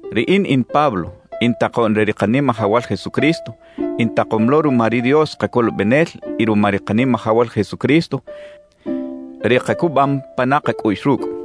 Riꞌin in Pablo, in takoꞌn re ri Kanimajawal Jesucristo, intakom lo ruma ri Dios Kacolobenel y ruma ri Kanimajawal Jesucristo, ri kacubam pana kacꞌuꞌx rucꞌ.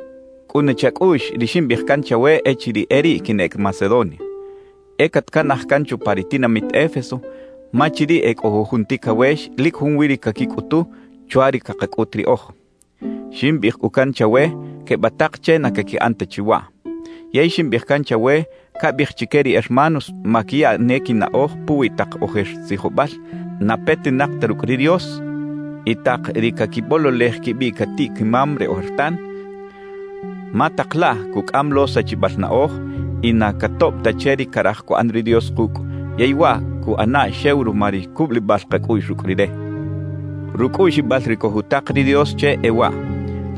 Cꞌuna chacꞌuꞌx ri ximbiꞌij can chawe echiriꞌ e riꞌ quinꞌec Macedonia: E catcanaj can chupa ri tinamit Éfeso ma chiriꞌ e cꞌo jujun ticawex lic junwi ri caquicꞌutu chwa ri cakacꞌut riꞌoj. Ximbiꞌij cꞌu can chawe quebatak che na caquiꞌan ta chi waꞌ. Yey ximbiꞌij can chawe cabiꞌij chique ri hermanos maquiya ne quinaꞌoj puwi tak ojer tzijobal na petinak ta rucꞌ ri Dios y tak ri caquibololej quibiꞌ catiꞌ-quimam re ojertan, ma tak laꞌ cucꞌam lo sachibal naꞌoj y na catoꞌb ta che ri caraj cuꞌan ri Dios kucꞌ, yey waꞌ cuꞌana xew ruma ri cubulibal kacꞌuꞌx rucꞌ Rire. Rucꞌuꞌxibal ri cojutak ri Dios che e waꞌ: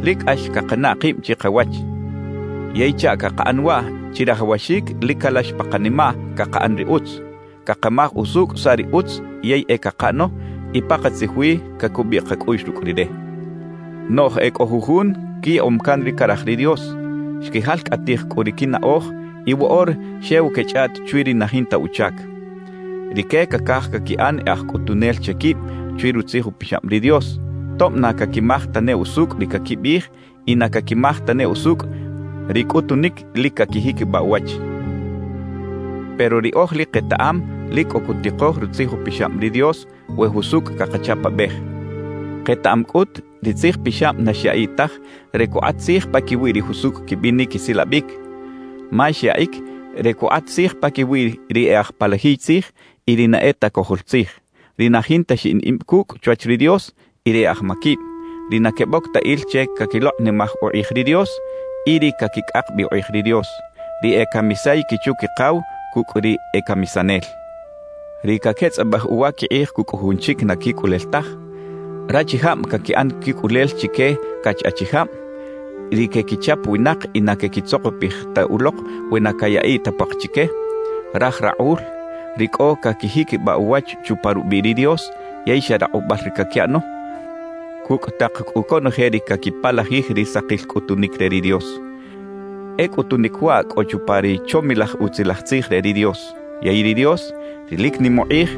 Lic cꞌax cakanaꞌ kib chikawach. Yey chaꞌ cakaꞌan waꞌ chirajawaxic lic calax pa kanimaꞌ cakaꞌan ri utz, cakamaj usucꞌ saꞌ ri utz yey e cakaꞌano, y pakatzij wi cacubiꞌ kacꞌuꞌx rucꞌ Rire. Noꞌj e cꞌo jujun quiyaꞌom can ri caraj ri Dios; xquijalcꞌatij cꞌu ri quinaꞌoj y woꞌora xew quechꞌaꞌt chwi ri na jinta uchac. Rique cacaj caquiꞌan e aj cꞌutunel che quib chwi Rutzij Upixab ri Dios, tob na caquimaj tane usucꞌ ri caquibiꞌij y na caquimaj tane usucꞌ ri cꞌutunic lic caquijiquibaꞌ uwach. Pero riꞌoj lic ketaꞌam lic cꞌo cutikoj Rutzij Upixab ri Dios we jusucꞌ cakachapabej. Ketaꞌam cꞌut ri Tzij Pixab na xyaꞌiꞌ taj re cukꞌat tzij paquiwi ri jusucꞌ quibinic quisilabic; ma xyaꞌic re cukꞌat tzij paquiwi ri e aj palajiy tzij y ri na e ta cojol tzij, ri na jinta xiꞌin ib cucꞌ chwach ri Dios y ri e aj maquib, ri na queboc ta il che caquilokꞌnimaj ukꞌij ri Dios y ri caquicꞌak bi ukꞌij ri Dios; ri e camisay quichu-quikaw cucꞌ ri e camisanel, ri caquetzꞌabej uwa quikꞌij cucꞌ jujun chic na quicꞌulel taj, rachijab caquiꞌan quicꞌulel chique cach achijab, ri quequichap winak y na quequitzokopij ta ulok we na cayaꞌiꞌ ta puak chique, raj rakꞌul, ri cꞌo caquijiquibaꞌ uwach chupa rubiꞌ ri Dios yey xa rakꞌubal ri caquiꞌano, cucꞌ tak cꞌu conoje ri caquipalajij ri sakil cꞌutunic re ri Dios. E cꞌutunic waꞌ cꞌo chupa ri chomilaj Utzilaj Tzij re ri Dios. Yey ri Dios, ri lic nim ukꞌij,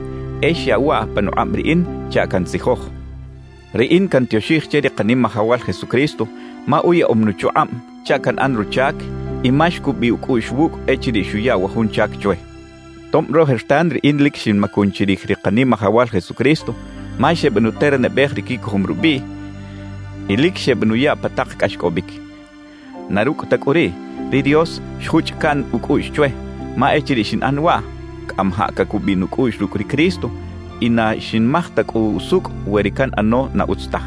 e xyaꞌw waꞌ panukꞌab riꞌin chaꞌ cantzijoj. Riꞌin cantioxij che ri Kanimajawal Jesucristo ma uyaꞌom nuchukꞌab chaꞌ canꞌan ruchac y ma xcubiꞌ ucꞌuꞌx wucꞌ echiriꞌ xuya wa jun chac chwe, tob rojertan riꞌin lic xinmacun chirij ri Kanimajawal Jesucristo ma xebenuternabej ri quicojom rubiꞌ y lic xebenuya pa tak cꞌaxcꞌobic. Na rucꞌ ta cꞌu riꞌ, ri Dios xjuchꞌ caꞌn ucꞌuꞌx chwe; ma echiriꞌ xinꞌan waꞌ, cꞌamajaꞌ cacubiꞌ nucꞌuꞌx rucꞌ ri Cristo y na xinmaj ta cꞌu usucꞌ we ri canꞌano na utz taj.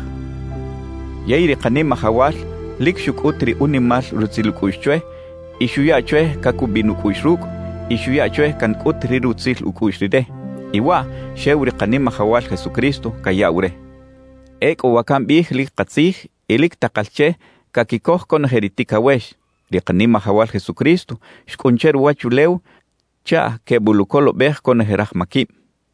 Yey ri Kanimajawal lic xucꞌut ri unimal rutzil ucꞌuꞌx chwe y xuya chwe cacubiꞌ nucꞌuꞌx rucꞌ y xuya chwe cancꞌut ri rutzil ucꞌuꞌx Rire; y waꞌ xew ri Kanimajawal Jesucristo cayaꞌw re. Ecꞌu wa cambiꞌij lic katzij y lic takal che caquicoj conoje ri ticawex: Ri Kanimajawal Jesucristo xcꞌun che ruwachulew chaꞌ queboluꞌcolobej conoje raj maquib.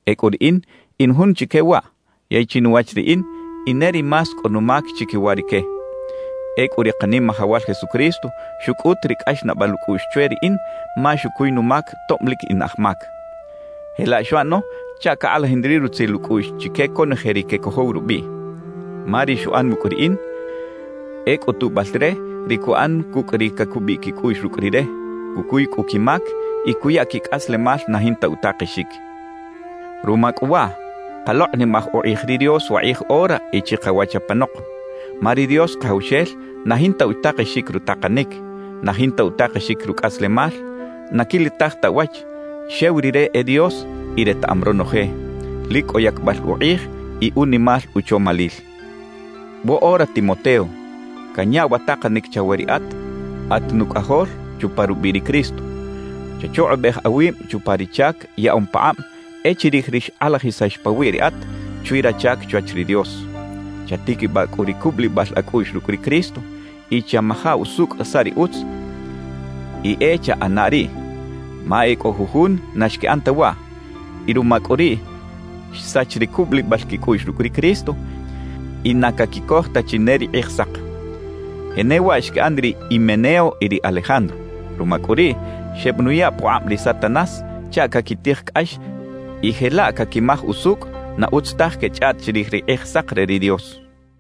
Ecꞌu riꞌin in jun chique waꞌ; yey chinuwach riꞌin, in ne ri más cꞌo numac chiquiwa rique. Ecꞌu ri Kanimajawal Jesucristo xucꞌut ri cꞌaxnaꞌbal ucꞌuꞌx chwe riꞌin ma xucuy numac tob lic in aj mac. Jelaꞌ xuꞌano chaꞌ cakꞌalajin ri rutzil ucꞌuꞌx chique conoje ri quecojow rubiꞌ. Ma ri xuꞌan wucꞌ riꞌin e cꞌutubal re ri cuꞌan cucꞌ ri cacubiꞌ quicꞌuꞌx rucꞌ Rire, cucuy cꞌu quimac y cuya quicꞌaslemal na jinta utakexic. Ruma cꞌu waꞌ, kalokꞌnimaj ukꞌij ri Dios wakꞌij ora y chikawach apanok. Ma ri Dios Kajawxel na jinta utakexic rutakanic, na jinta utakexic rucꞌaslemal, na quilitaj ta uwach, xew Rire e Dios y retaꞌam ronoje. Lic cꞌo yacbal ukꞌij y unimal uchomalil. Woꞌora Timoteo, canya wa takanic chawe riꞌat at nucꞌajol chupa rubiꞌ ri Cristo: Chachukꞌubej awib chupa ri chac yaꞌom pakꞌab e chirij ri xkꞌalajisax pawiꞌ riꞌat chwi rachac chwach ri Dios. Chatiquibaꞌ cꞌu ri cubulibal acꞌuꞌx rucꞌ ri Cristo y chamaja usucꞌ saꞌ ri utz y e chaꞌana riꞌ. Ma e cꞌo jujun na xquiꞌan ta waꞌ, y ruma cꞌu riꞌ xsach ri cubulibal quicꞌuꞌx rucꞌ ri Cristo y na caquicoj ta chi ne ri Kꞌijsak. Jenewaꞌ xquiꞌan ri Himeneo y ri Alejandro. Ruma cꞌu riꞌ, xebenuya pukꞌab ri Satanás chaꞌ caquitij cꞌax y jelaꞌ caquimaj usucꞌ na utz taj quechꞌaꞌt chirij ri Kꞌijsak re ri Dios.